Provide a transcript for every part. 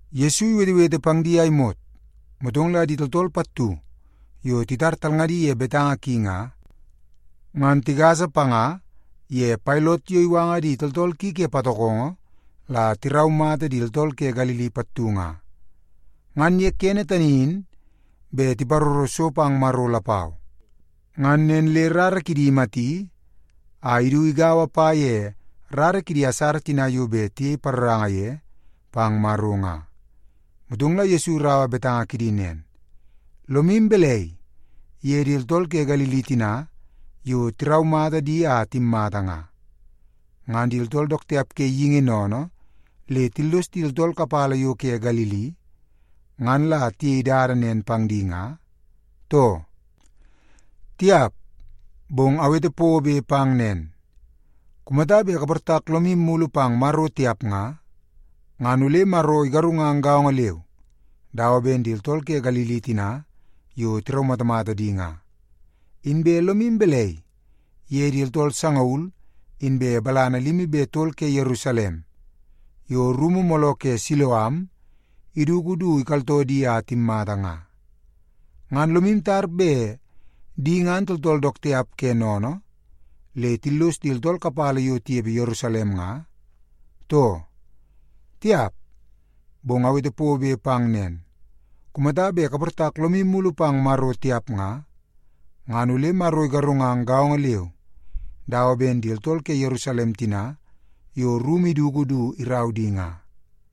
Yesu iwetewete pang di a imot, motong la di tooltool pattu yo titar talngadi ye betanga ki nga, ngan tigasa panga ye Pailot yo iwanga di tooltool ki ke patokongo la tiraumata di tooltool ke Galili pattu nga. Ngan ye kene tani in bet tiparoro so pang Maro lapau. Ngan nen le rara kidi imati a idu igaua pa ye rara kidi asara tina yo bet tiyei paroranga ye pang Maro nga. Motong la Yesu iraua betanga kidi nen, “Lomu balai ye di tooltool ke Galili tina yo tiraumata di a timmata nga, ngan di tooltool dook tiap ke geingi sennene le tillos di tooltool kapala yo ke Galili, ngan la tiyei dada nen pang di nga, too? Tiap! Bong awete pobe pang nen, kumata bet kaportak lomu mulu pang Maro tiap nga, ngan ole Maro igarungang gaongo leu dawa ben di tooltool ke Galili tina yo tiraumatamata di nga. Inbe lomu balai ye di tooltool sangaul inbe balana limi be tol ke Yerusalem yo rumu mooloo ke Siloam iduku du ikaltoo di a timmata nga? Ngan lomu tar bet di ngan tooltool dook tiap ke sennene le tillos di tooltool kapala yo tinepe Yerusalem nga, too? Tiap! Bong awete pobe pang nen, kumata bet kaportak lomu mulu pang Maro tiap nga, ngan ole Maro igarungang gaongo leu dawa ben di tooltool ke Yerusalem tina yo rumu iduku du irau di nga.”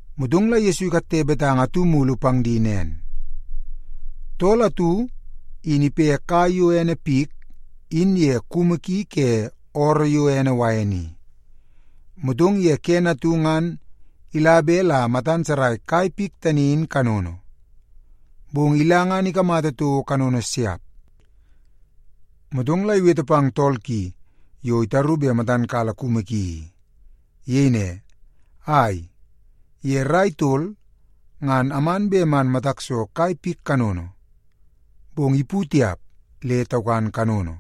Motong la Yesu ikatte betanga atu mulu pang di nen, “Tool atu in ipe kai yo ene pik in ye kumu ki ke ooroo yo ene wain i. Motong ye kene atu ngan ila bet la matan sarai kai pik tani in kanono, bong ila ngan ikamata toko kanono siap. Motong la iwete pang tool ki yo itaru bet matan kala kumu ki i. Iyei ne, ‘Ai, ye rai tol ngan aman bet man matak so kai pik kanono, bong ipu tiap, le taukan kanono.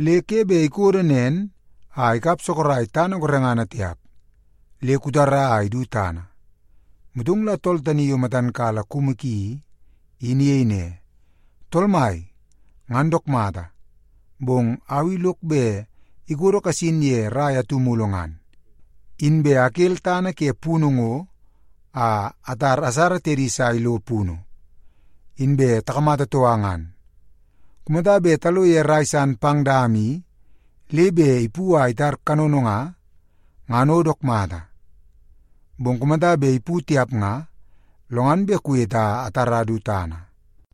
Le ke bet ikodo nen a ikap sorok tana gorengana tiap. Le kutara a idu tana.’ “Motong la tool tani yo matan kala kumu ki i, in iyei ne, ‘Tool mai, ngan dook mata, bong au i lok bet ikodo kasin ye rai atu mulu ngan, inbe akel tana ke punu ngo a atar asara tedi sa ilo punu, inbe takamata toka ngan. Kumata bet talo ye rai san pang dama i, le bet ipu a itar kanono nga, ngan o dook mata. Bong kumata bet ipu tiap nga, lo ngan bet kuwete a atara du tana.’”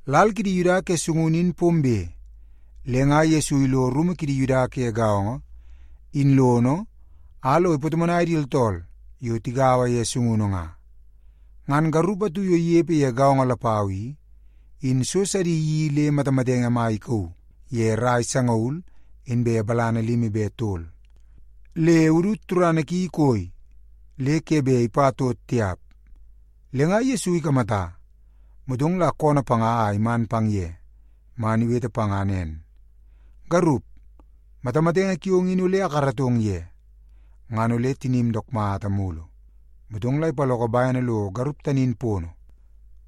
Lal kidi Yuda ke sungunu in pombe, le nga Yesu ilo rumu kidi Yuda ke gaongo in lono a lo ipatomonai di tooltool yo tigaua ye sungunu nga. Ngan garup atu yo inepe ye gaongo lapau i, in so sidi iyeii le matamatenge mai ikauu ye rai sangaul inbe balana limi be tol. Le udut turana ki ikoi le ke bet ipa tot tiap. Le nga Yesu ikamata, motong la koonoo panga a iman pang ye, man iwete panga nen, “Garup, matamatenge kiong in ole akaratong ye, ngan ole tinim dook mata mulu.” Motong la ipaloko bene lo garup tani in pono,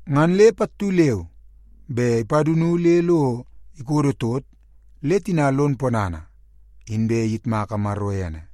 ngan le pattu leu be ipadunu le lo ikodo tot le tina lon ponana, inbe iyitmaka Maro ene.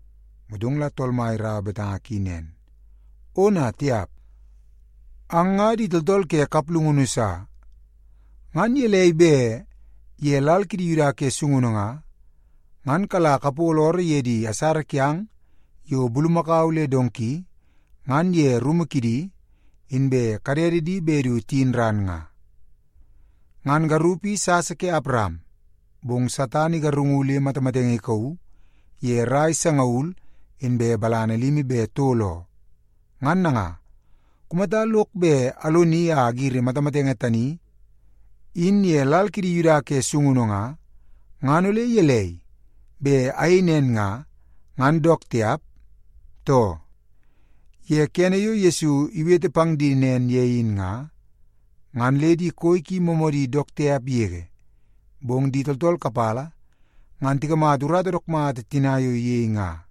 Motong la Tool Mai iraua betanga ki nen, “Ona tiap! Ang nga di tooltool ke kaplungunu sa. Ngan gelei bet ye lal kidi Yuda ke sungunu nga, ngan kala kapolo ooroo ye di asara kiang yo bulumakau le donki ngan ye rumu kidi, inbe kadede di bet du tiyin ran nga? Ngan garup i sasa ke Awaram, bong Satan igarungu le matamatenge ikauu ye rai sangaul inbe balana limi be tol oo. Ngan nanga, kumata lok bet aloni a agiri matamatenge tani in ye lal kidi Yuda ke sungunu nga, ngan ole gelei, bet ayei nen nga, ngan dook tiap, too?” Ye kene yo Yesu iwete pang di nen ye in nga, ngan le di koi ki moomoodi dook tiap yege. Bong di tooltool kapala ngan tikamata urata dook mata tina yo iyei nga,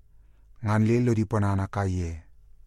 ngan le lodi ponana kaiye.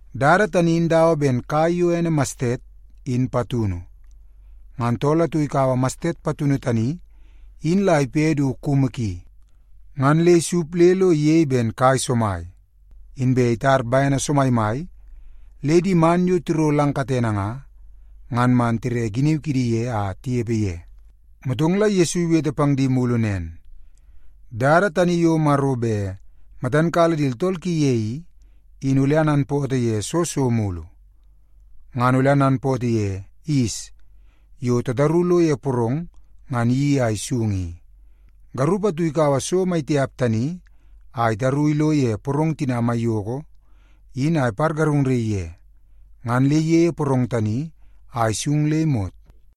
Dada yo Maro bet matan kala di tooltool ki ye i, in dawa ben kai yo ene mastet, in patunu. Ngan tool atu ikaua mastet patunu tani in la ipe du kumu ki, ngan le isup le lo iyei ben kai somai. Inbe itar bene somaimai le di man yo tiro lang katene nga, ngan man tire giniu kidi ye a tinepe ye.” Motong la Yesu iwete pang di mulu nen, “Dada tani yo Maro bet matan kala di tooltool ki ye i, in ole ananpootoo ye soo so mulu? Nga ole ananpootoo ye yis yo tataru lo ye porong ngan iyeii a isung i. Garup atu ikaua so mai tiap tani a itaru ilo ye porong tina maiyoko in a ipargarungnaii ye, ngan le iyeie porong tani a isung le imot.”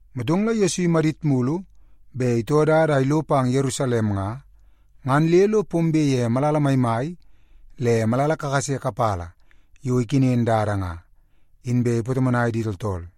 Motong la Yesu imadit mulu bet itoo dada a ilo pang Yerusalem nga, ngan le lo pombe ye malala maimai le malala kakase kapala yo ikenen dada nga, inbe ipatomonai di tooltool.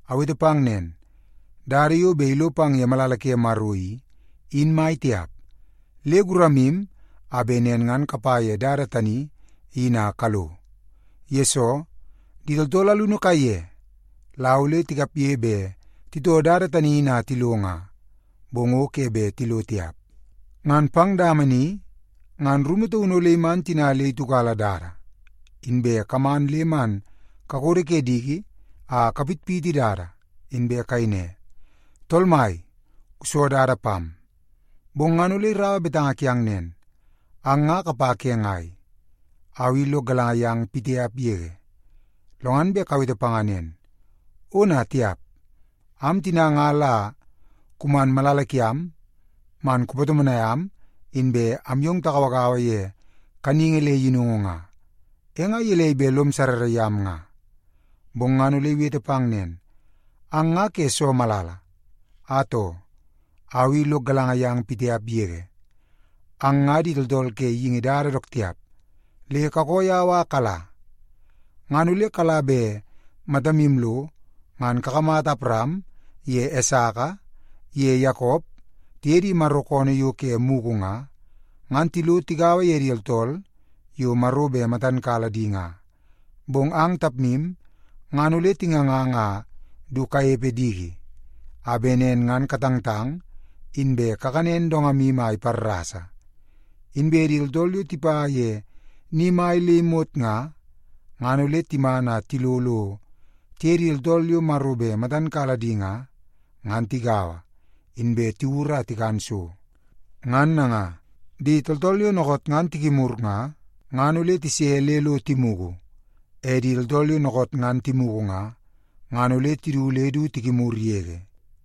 “Awete pang nen, dada yo bet ilo pang ye malala ke Maro i, in mai tiap. Le guramu a bet nen ngan kapa ye dada tani in a kalo. Yesoo, di tooltool alunu kaiye la ole tikapge bet titoo dada tani in a tilo nga, bong o ke bet tilo tiap. Ngan pang dama ni ngan rumu taunu ole iman tina le itiukala dada, inbe kaman le man kakodo ke diki a kapitpiti dada, inbe kayei ne, ‘Tool Mai, kuso dada pam.’ “Bong ngan ole iraua betanga kiang nen, ‘Ang nga kapa ke ngai? Au i lok galanga yang pitiap yege.’ “Lo ngan bet kawete panga nen, ‘Ona tiap! Am tina nga la kuman malala kiam man kupatomonai am inbe am yong tagauagaua ye kaningi le yinungu nga, e nga gelei bet lom sarrara yam nga?’ “Bong ngan ole iwete pang nen, ‘Ang nga ke soo malala? Atoo, au i lok galanga yang pitiap yege. Ang nga di tooltool ke geingi dada dook tiap, le kakoo yau a kala!’ “Ngan ole kala bet matamu lo ngan kakamata Awaram ye Esaka ye Yakop tiye di Maro koonoo yo ke mugu nga, ngan tilo tigaua di tooltool yo Maro bet matan kala di nga. Bong ang tapmu ngan ole tingangang a du kanepe diki, a bet nen ngan katangtang, inbe kakanen dongamu a iparrasa. Inbe di tooltool yo tipa ye ni mai le imot nga, ngan ole timan a tilo lo tiye di tooltool yo Maro bet matan kala di nga, ngan tigaua, inbe tiwur a tikan so. Ngan nanga, di tooltool yo dookoot ngan tikimur nga, ngan ole tise le lo timugu. E di tooltool yo dookoot ngan timugu nga, ngan ole tidu le du tikimur yege.”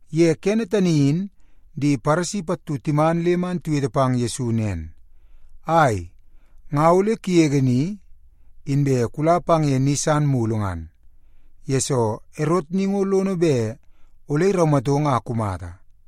Ye kene tani in di Paresi pattu timan le man tiwete pang Yesu nen, “Ai, nga ole kugege ni, inbe kula pang ye ni sa mulu ngan, yesoo Erot ni ngo lono bet ole iraumatong a kumata.”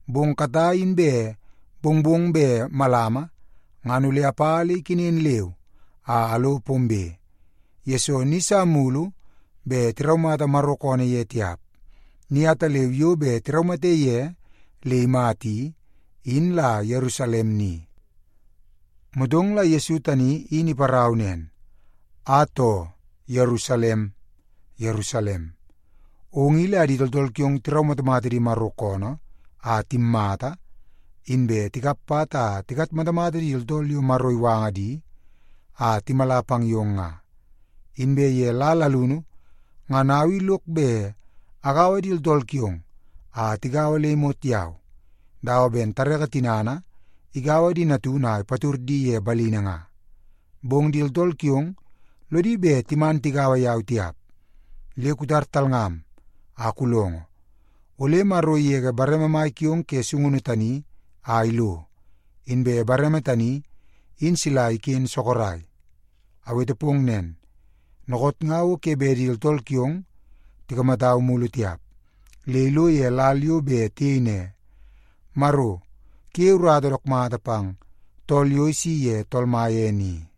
Bong katai inbe mongmong bet malama ngan ole apa le ikenen leu a alo pombe, yesoo ni sa mulu bet tiraumata Maro koonoo ye tiap. Ni ataleu yo bet tiraumate ye le imata i, in la Yerusalem ni.” Motong la Yesu tani in iparau nen, “Atoo, Yerusalem, Yerusalem, ong i la di tooltool kiong tiraumatamata di Maro koonoo a timmata, inbe tikap pat a tikatmatamata di tooltool yo Maro iwanga di a timala pang yong nga. Inbe ye lal alunu ngan au i lok bet agaua di tooltool kiong a tigaua le imot yau, dawa ben tareke tinana igaua di natunu a ipatud di ye balini nga. Bong di tooltool kiong lodi bet timan tigaua yau tiap. Le kutar talngam a kulongo, ole Maro igege bareme mai kiong ke sungunu tani a ilo, inbe bareme tani in sila iken sorok. Awete pong nen, dookoot nga o ke bet di tooltool kiong tikamatau mulu tiap, le ilo ye lal yo bet tiyei ne, ‘Maro kuyeie urata dook mata pang tool yo isi ye Tool Mai ene i.’”